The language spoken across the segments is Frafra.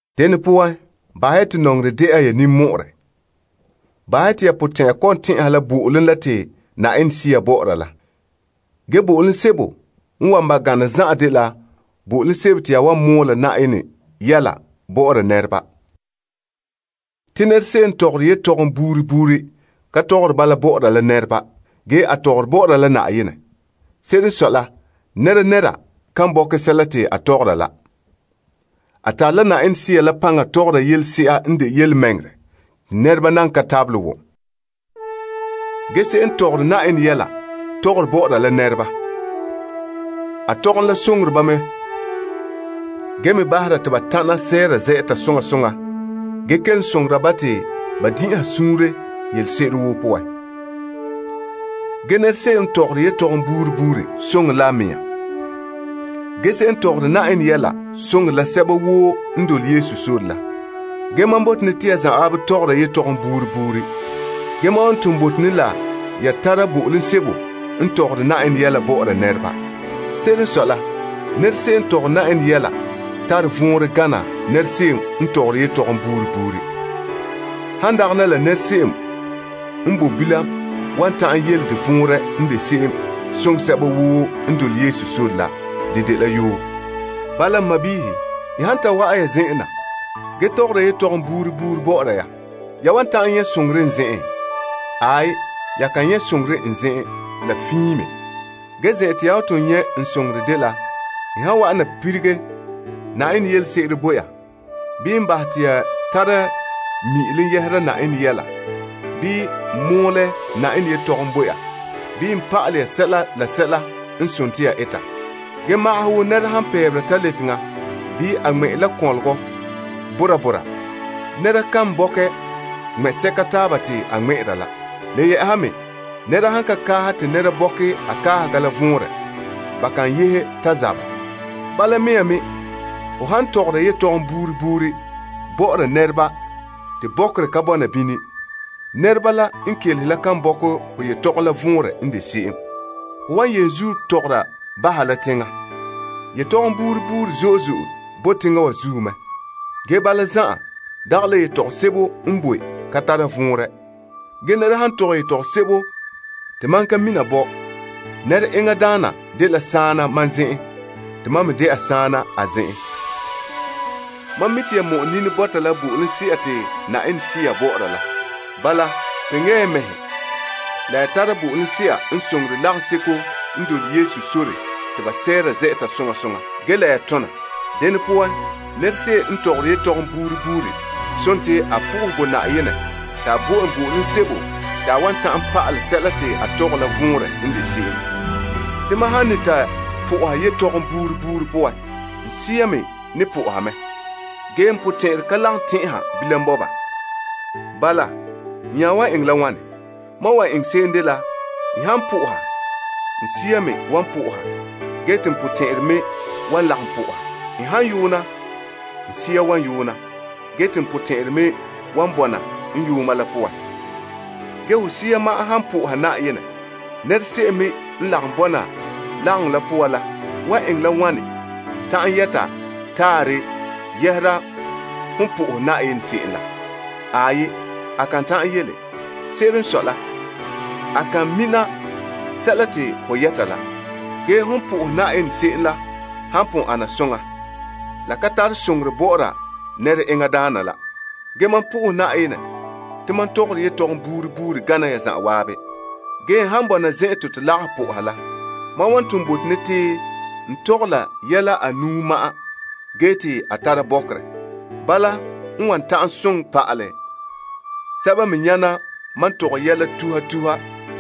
Dene poan, bahɛ ya te nɔŋerɛ de'a ya ninmɔ'ɔrɛ. Bahɛ ya te ya potɛn'ya kɔ'ɔn tɛn'ɛha la bo'olom la te Yenɛ Sea bɔ'ɔra la. Ge, bo'olom sebo n wan ba gana zan'an dela bo'olom sebo te ya wan mɔɔla Na'ayenɛ yɛla bɔ'ɔra nɛreba. Te nɛra se'em n tɔgɔre yetɔgom buuri buuri ka tɔgɔre bala bɔ'ɔra la nɛreba, ge a tɔgɔre bɔ'ɔra la Na'ayenɛ. Se'ere n sɔe la, nɛnɛra kan bɔkɛ sɛla te a tɔgɔra la. A tare la Yenɛ Sea la paŋa tɔgɔra yelese'a n de yelemɛŋɛrɛ te nɛreba nan ka tabelɛ wom. Ge, se'em n tɔgɔre Yenɛ yɛla, tɔgɔre bɔ'ɔra la nɛreba. A tɔgom la soŋore ba mɛ zo'e zo'e, gee me bahera ba te ba ta'ana sɛɛra zɛ'ɛta soŋa soŋa gee kelom soŋora ba te ba din'inha suunre yelese'ere woo poan. Ge nɛra se'em n tɔgɔre yetɔgom buuri buuri soŋore la a mea. Ge, se'em n tɔgɔre Na'ayenɛ yɛla soŋore la sɛba woo n dole Yesu sore la. Ge mam bote ne te ya zanwaabe tɔgɔra yetɔgom buuri buuri. Ge, mam wa ton bote ne la ya tara bo'olom sebo n tɔgɔre Na'ayenɛ yɛla bɔ'ɔra nɛreba. Se'ere n sɔe la, nɛra se'em n tɔgɔre Na'ayenɛ yɛla tare vɔnrɛ gana nɛra se'em n tɔgɔre yetɔgom buuri buuri. Han dagana la nɛra se'em n bo bilam wan ta'an yele de vɔnrɛ n de se'em soŋɛ sɛba woo n dole Yesu sore la, de dela yoo. Bala, n sɔɔnrɔ, n han ta wa'an ya zen'en na, gee tɔgɔra yetɔgom buuri buuri bɔ'ɔra ya, ya wan ta'an nyɛ' soŋorɛ n zen'en? Aai, ya kan nyɛ' soŋorɛ n zen'en la fiin me. Ge zen'an te ya wan ton nyɛ' n soŋorɛ dela n han wa'ana lilige Yenɛ yelese'ere bo ya, bii n bahɛ ya te ya tara mi'ilom yɛhera Na'ayenɛ yɛla, bii n mɔɔlɛ Na'ayenɛ yetɔgom bo ya, bii n pa'alɛ ye sɛla la sɛla n sontii ya eta. Ge magaha wo nɛra han pɛɛbera taleteŋa, bii a ŋmɛ'ɛre la kɔnlɔgɔ bɔra bɔra, nɛra kan bɔkɛ ŋmɛ'sɛka taaba te a ŋmɛ'ɛra la. Le yɛ'ɛha me, nɛra han ka kaahɛ te nɛreba bɔkɛ a kaahega la vɔnrɛ, ba kan yehe ta zabɛ. Bala mea me nɔɔ, ho han tɔgɔra yetɔgom buuri buuri bɔ'ɔra nɛreba te bɔkerɛ ka bɔna bini, nɛreba la n kelehe la kan bɔkɛ ho yetɔgom la vɔnrɛ n de se'em. Ho wan yenzuo tɔgɔra baha la teŋa. Yetɔgom buuri buuri zo'e zo'e bo teŋa wa zuo mɛ. Ge, bala zan'an, dagɛ la yetɔgom sebo n boe ka tara vɔnrɛ. Ge, nɛra han tɔgɛ yetɔgom sebo te mam ka mina bɔ nɛra enŋa daana dela saana mam zen'en te mam me de'a saana a zen'en. Mam mi' te ya mɔ'ɛ nini bɔta la bo'olomse'a te Yenɛ Sea bɔ'ɔra la. Bala, kpeŋe ya ya mɛhe la ya tara bo'olomse'a n soŋore lagaŋseko n dole Yesu sore te ba sɛɛra zɛ'ɛta soŋa soŋa gee la ya tona mɛ zo'e zo'e. Dene poan, nɛra se'em n tɔgɔre yetɔgom buuri buuri sontii a po'ohɛ bo Na'ayenɛ te a bo en bo'olom sebo te a wan ta'an pa'alɛ sɛla te a tɔgɛ la vɔnrɛ n de se'em. Te mam han ne ta po'oha yetɔgom buuri buuri poan, n sea me ne po'oha mɛ. Ge, n potɛn'ɛrɛ ka lagom tɛn'ɛha bilam bɔba. Bala, n nya wan eŋɛ la wane? Mam wan eŋɛ se'em dela n han po'oha, n sea me wan po'oha gee te n potɛn'ɛrɛ me wan lagom po'oha. N han yoona, n sea wan yoona, gee te n potɛn'ɛrɛ me wan bɔna n yooma la poan. Ge ho sea ma'an han po'oha Na'ayenɛ, nɛra se'em me n lagom bɔna lagaŋɔ la poan la wan eŋɛ la wane ta'an yete taarɛ yɛhera hon po'ohɛ Na'ayenɛ se'em la? Aai, A kan ta'an yele. Se'ere n sɔe la, a kan mina sɛla te ho yɛta la. La de sera te hon po'ohɛ Na'ayenɛ se'em la han pon ana soŋa, la ka tare soŋorɛ bɔ'ɔra nɛra enŋa daana la. Ge mam po'ohɛ Na'ayenɛ te mam tɔgɔre yetɔgom buuri buuri gana ya zanwaabe. Ge, n han bɔna zen'an te to lagaha po'oha la, mam wan ton bɔta te n tɔgɛ la yɛla anuu ma'an gee te a tara bɔkerɛ. Bala, n wan ta'an soŋɛ pa'alɛ sɛba me nyana mam tɔgɛ yɛla tuha tuha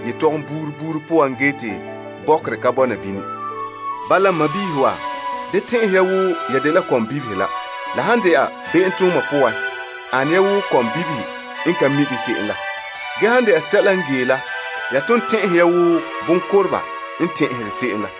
yetɔgom buuri buuri poan gee te bɔkerɛ ka bɔna bini. Bala, n sɔɔnrɔ wa, da tɛn'ɛhe ya wo ya dela kɔmbibihe la. La han de'a be'emtooma poan, ane ya wo kɔmbibihe n ka mi' de se'em la, gee han de'a sɛla n gee la ya ton tɛn'ɛhe ya wo bonkoteba n tɛn'ɛhe se'em la.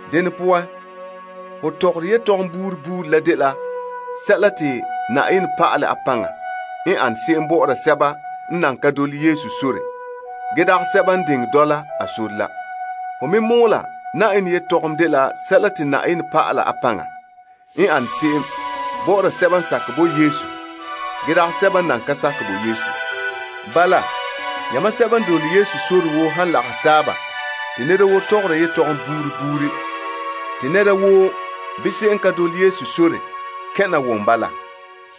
Dene poan, ho tɔgɔra yetɔgom buuri buuri la dela sɛla te Na'ayenɛ pa'ala a paŋa n an se'em bɔ'ɔra sɛba n nan ka dole Yesu sore gee dagɛ sɛba n diŋɛ dɔla a sore la. Ho me mɔɔla Na'ayenɛ yetɔgom dela sɛla te Na'ayenɛ pa'ala a paŋa n an se'em bɔ'ɔra sɛba n sakɛ bo Yesu gee dagɛ sɛba n nan ka sakɛ bo Yesu. Bala, yamam sɛba n dole Yesu sore woo han lagahɛ taaba te nɛra woo tɔgɔra yetɔgom buuri buuri te nɛra woo bii se'em n ka dole Yesu sore kɛn' na wom bala,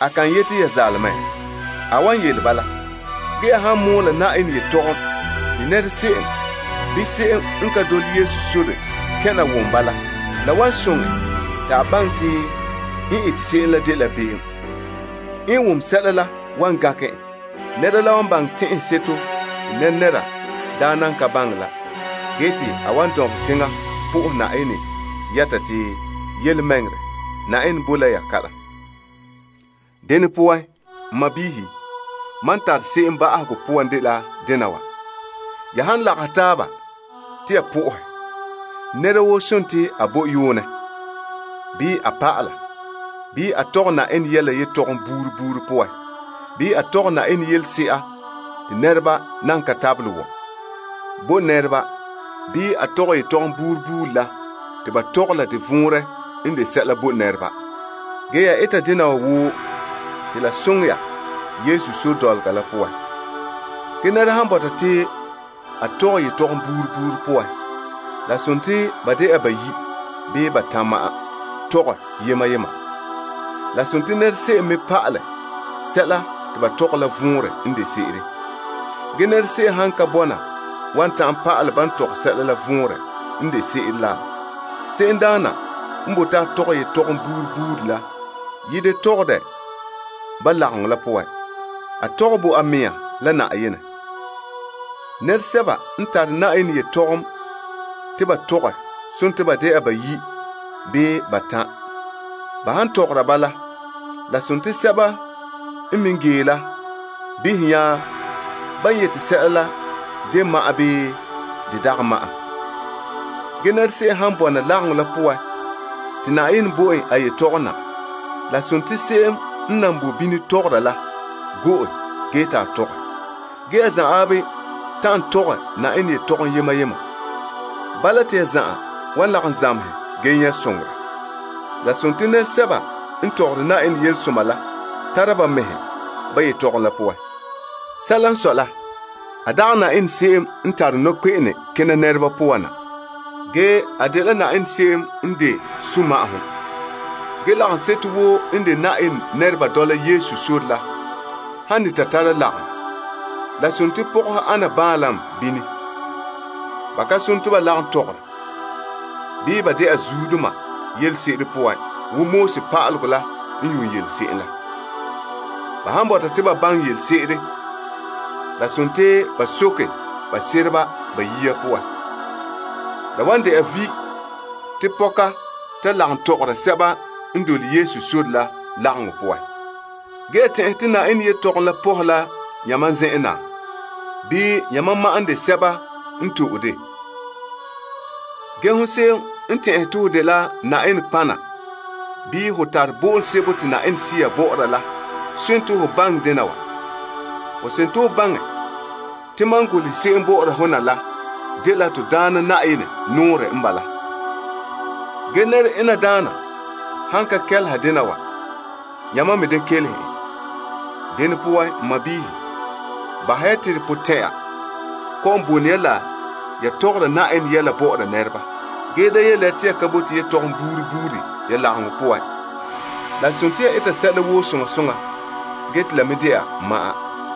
a kan yete ya zaale mɛ? A wan yele bala. Ge, ya han mɔɔla Na'ayenɛ yetɔgom te nɛra se'em bii se'em n ka dole Yesu sore kɛn' na wom bala, la wan soŋɛ en te a baŋɛ te n ete se'em la dela be'em. N wom sɛla la wan gankɛ en. Nɛreba wan baŋɛ a tɛn'ɛseto te nɛnɛra daa nan ka baŋɛ la gee te a wan dɔnbelɛ teŋa po'ohɛ Na'ayenɛ yɛta te, Yelemɛŋɛrɛ, Na'ayenɛ bo la ya kalam. Dene poan, n sɔɔnrɔ, mam n tare se'em ba'ahegɔ poan dela dena wa. Ya han lagahɛ taaba te ya po'ohɛ, nɛra woo sontii a bo yoonɛ, bii a pa'ala, bii a tɔgɛ Na'ayenɛ yɛla yetɔgom buuri buuri poan, bii a tɔgɛ Na'ayenɛ yelese'a te nɛreba nan ka tabelɛ wom, bo nɛreba bii a tɔgɛ yetɔgom buuri buuri la te ba tɔgɛ la vɔnrɛ n de sɛla bo nɛreba. Ge, ya eta dena wa woo la ya lagom la n dole Yesu sore poan la som zuo. Ge nɛra han bɔta te a tɔgɛ yetɔgom buuri buuri poan, la sontii ba de'a ba bayi' bii ba batan' ma'an tɔgɛ yema yema. La sontii nɛra se'em me pa'alɛ sɛla te ba tɔgɛ la vɔnrɛ n de se'ere. Ge, nɛra se'em han ka bɔna wan ta'an pa'alɛ ban tɔgɛ sɛla la vɔnrɛ n de se'ere la, se'emdaana n bote a tɔgɛ yetɔgom buuri buuri yi da tɔgɛ dɛ ba lagaŋɔ la poan. A tɔgɛ bo a mea la Na'ayenɛ. Nɛresɛba n tare Na'ayenɛ yetɔgom te ba tɔgɛ sontii ba de'a ba bayi' bii ba batan'. Ba han tɔgɔra bala, la sontii sɛba n me gee la behɛ nya ban yete sɛla la de ma'an bii de dagɛ ma'an. Ge, nɛra se'em han bɔna lagaŋɔ la poan te Na'ayenɛ bo en a yetɔgom na, la sontii se'em n nan bo bini tɔgɔra la go'e gee te a tɔgɛ. Ge ya zanwaabe ta'an tɔgɛ Na'ayenɛ yetɔgom yema yema. Bala, te ya zan'an wan lagom zamehɛ gee nyɛ' soŋorɛ. La sontii nɛresɛba n tɔgɔre Na'ayenɛ yelesoma la tara ba mɛhe ba yetɔgom la poan. Sɛla n sɔe la, a dagɛ Na'ayenɛ se'em n tare nɔkpe'ene kena nɛreba poan na, ge a dela se'em n de sunma'ahom. Ge lagaŋseto woo n de Na'ayenɛ nɛreba dɔla Yesu sore la han ne ta tara lagaŋɔ, la sontii pɔgɔhe ana baanlam bini. Ba ka sone te ba lagom tɔgɔra, bii ba de'a zuodoma yelese'ere poan wo Pa'alegɔ la n yuun yelese'em la. Ba han bɔta te ba baŋɛ yelese'ere, la sontii ba ta soke ba sereba ba yea poan. La wan de'a vi' te pɔka ta lagom tɔgɔra sɛba n dole Yesu sore la lagaŋɔ poan. Ge ya tɛn'ɛhe te Na'ayenɛ yetɔgom la pɔhɛ la yamam zen'en na, bii yamam ma'an n de sɛba n to'e de? Ge hon se'em n tɛn'ɛhe te ho dela Na'ayenɛ kpana bii ho tare bo'olom sebo te Yenɛ Sea bɔ'ɔra la sontii ho baŋɛ dena wa. Ho sontii ho baŋɛ te mam golehɛ se'em bɔ'ɔra ho na la dela to Daana Na'ayenɛ nɔɔrɛ n bala. Ge, nɛra ena daana han ka kɛleha dena wa, yamam me da kɛleha en. Dene poan, n sɔɔnrɔ, bahɛ ya te ya potɛn'ya kɔ'ɔn bone ya la ya tɔgɔra Na'ayenɛ yɛla bɔ'ɔra nɛreba. Ge, da yele ya te ya ka bote yetɔgom buuri buuri ya lagaŋɔ poan. La sontii ya eta sɛla woo soŋa soŋa, gee te la me de'a ma'an.